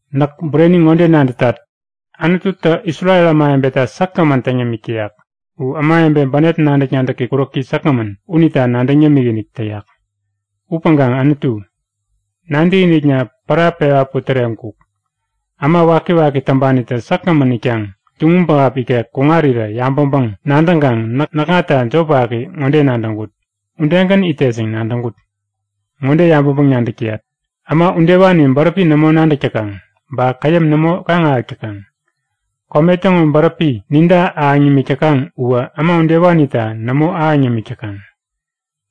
Näk bureni ŋode nadätat; Anututä Isrel ämawebeta säkgämän täŋ yämik täyak. U ämawebe bänep nadäk-nadäki kuräki säkgämän unita nadäŋ yämik-inik täyak. Upäŋkaŋ Anutu, nadäkinikna pära pewa putäreŋkuk. Äma wakiwaki täŋpanitä säkgämän itkaŋ tuŋum pähap ikek kuŋarirä yabäŋpäŋ-nadäŋkaŋ näkŋata jop waki ŋode nadäŋkut; Udegän itet yäŋ nadäŋkut. Ŋode yabäŋpäŋ-nadäk täyat; Äma udewani bäräpi nämo nadäk täkaŋ ba käyäm nämo kaŋ-ahäk täkaŋ. Kome täŋo bäräpi ninta ahäŋ nimik täkaŋ uwä äma udewanita nämo ahäŋ yämik täkaŋ.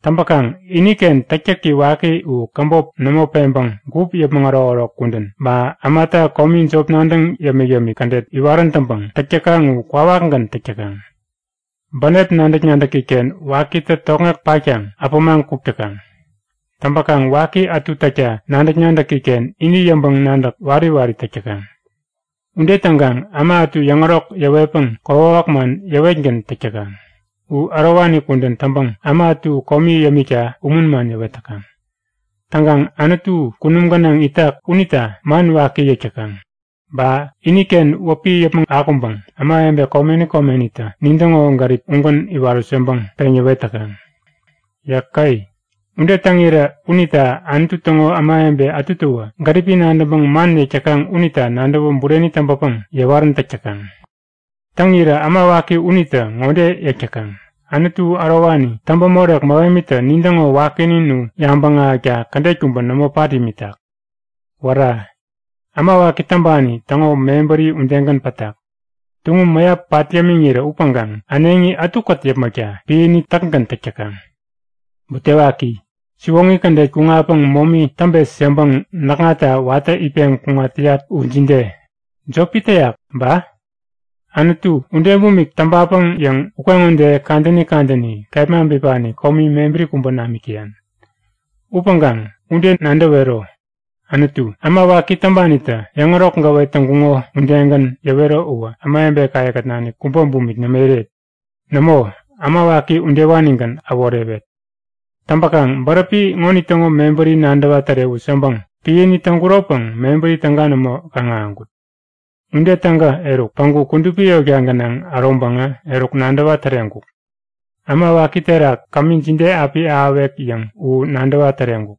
Täŋpäkaŋ iniken täktäki waki u käbop nämo peŋpäŋ gup yäpmäŋ ärokärok kudän ba ämata komi jop nadäŋ yämik-yämik kädet iwarän täŋpäŋ täk täkaŋ u kwawakgän täk täkaŋ. Bänep nadäk-nadäki-ken wakitä tokŋek patkaŋ abämaŋ kuk täkaŋ. Täŋpäkaŋ waki ätu täkta nadäk-nadäki-ken ini yäŋpäŋ-nadäk wari wari täk täkaŋ. Ude täŋkaŋ äma ätu yäŋärok yäwetpäŋ kokwawak man yäwetgän täk täkaŋ. U ärowani kudän täŋpäŋ äma ätu komi yämikta umun man yäwet täkaŋ. Täŋkaŋ Anutu kunum gänaŋ itak unita man waki yäk täkaŋ. Ba iniken wäpi yäpmäŋ akuŋpäŋ ämawebe komeni komenitä nintäŋo gärip ugän iwarut yäŋpäŋ peŋ yäwet täkaŋ. Yäke! Ude täŋirä unita Anutu täŋo ämawebe ätutäwä gäripi nadäŋpäŋ man yäk täkaŋ unita nadäwä bureni täŋpäpäŋ yäwarän täk täkaŋ. Täŋirä äma waki unitä ŋode yäk täkaŋ; Anutu ärowani täŋpämorek mähemitä nintäŋo wakinin u yabäŋ ahäkta kädet kubä nämo pat imitak. Wära! Äma waki täŋpani täŋo mebäri udegän pätak! Tuŋum mäyap pat yämiŋirä upäŋkaŋ äneŋi ätukät yäpmäkta piäni täkgän täk täkaŋ. Butewaki! Siwoŋi kädet kuŋatpäŋ momi täŋpet yäŋpäŋ näkŋatta watä itpeŋ kuŋat täyat u jide? Jopi täyak ba? Anutu, ude bumik täŋpapäŋ yäŋ ukeŋode kadäni kadäni kepma bipani komi mebäri kubä namik täyan. Upäŋkaŋ ude nadäwero! Anutu, äma waki täŋpanitä yäŋärok gäwet täŋkuŋo udegän yäwero uwä ämawebekaye-kät nanik kubä bumik nämo iret. Nämo, äma waki udewanigän äworewet! Täŋpäkaŋ bäräpi ŋonitäŋo mebäri nadäwa tärewut yäŋpäŋ piäni täŋkuropäŋ mebäri täga nämo kaŋ-ahäŋkut. Ude täŋkä eruk, päŋku kudupi yotka gänaŋ äroŋpäŋä eruk nadäwa täreŋkuk. Äma waki terak kämi jide api ahäwek yäŋ u nadäwa täreŋkuk.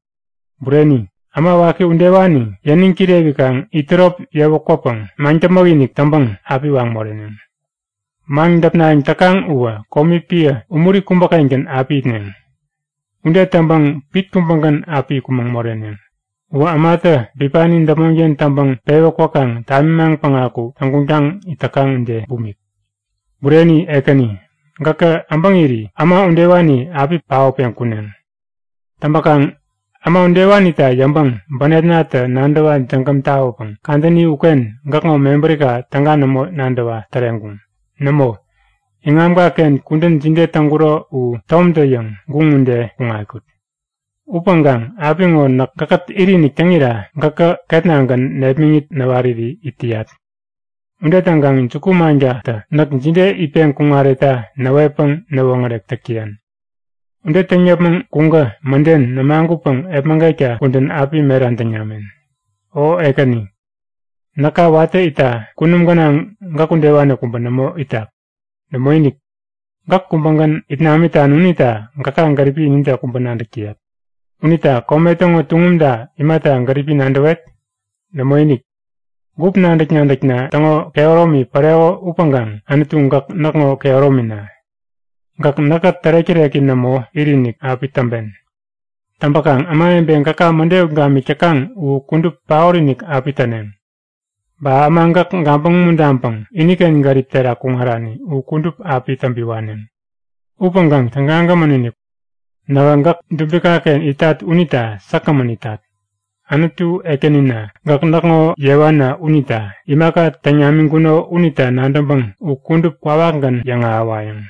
Bureni, äma waki udewani yäniŋ kirewikaŋ itärop yewä kwäpäŋ maŋdäpmäk-inik täŋpäŋ api waŋ moreneŋ! Maŋdäpnayäŋ täkaŋ uwä komi piä umuri kubäkengän api itneŋ. Ude täŋpäŋ pit kubägän api kumäŋ moreneŋ. Uwä ämatä bipani däpmonken täŋpäŋ pewä kwäkaŋ tamimaŋ päŋaku täŋguŋtaŋ it täkaŋ ude bumik. Bureni Ekäni, gäkä äbäŋiri äma udewani api paotpeŋ kuneŋ. Täŋpäkaŋ äma udewanita yäŋpäŋ bänepnatä nadäwa jägäm tawäpäŋ kadäni uken gäkŋo mebärika täga nämo nadäwa täreŋkuŋ. Nämo, iŋamkaken kudän jide täŋkuro u tomtä-yäŋ guŋ ude kuŋatkut. Upäŋkaŋ apiŋo näk gäkkät it-inik täŋira gäkä ketnagän nepmäŋit näwariri it täyat. Ude täŋkaŋ juku-mankatä näk jide itpäŋ kuŋaretta näwetpäŋ näwoŋärek täk täyan. Ude täŋ yäpmäŋ kuŋkä mäden nämagutpäŋ epmägetka kudän api meran täŋ namen. O Ekäni, näka watä itta kunum gänaŋ gäk udewani kubä nämo itak. Nämoinik. Gäk kubägän it namitan unita gäka gäripi inide kubä nadäk täyat. Unita kome täŋo tuŋumta imata gäripi nadäwet? Nämoinik! Gup nadäk-nadäkna täŋo kehäromi paoreko upäŋkaŋ Anutu gäk näkŋo kehäromina. Gäk näkkät tärek-täreki nämo it-inik api täŋpen. Täŋpäkaŋ ämawebe gäka mäde ut gamik täkaŋ u kudup paot-inik api täneŋ. Ba äma gäk gabäŋ umuntaŋpäŋ iniken gärip terak kuŋarani u kudup api täŋpi waneŋ. Upäŋkaŋ tägagämän-inik! Nähä gäk dubikaken itat unita säkgämän itat. Anutu Ekänina, gäk näkŋo yewana unita imaka täŋ namiŋkuno unita nadäŋpäŋ u kudup kwawakgän yäŋahäwayäŋ!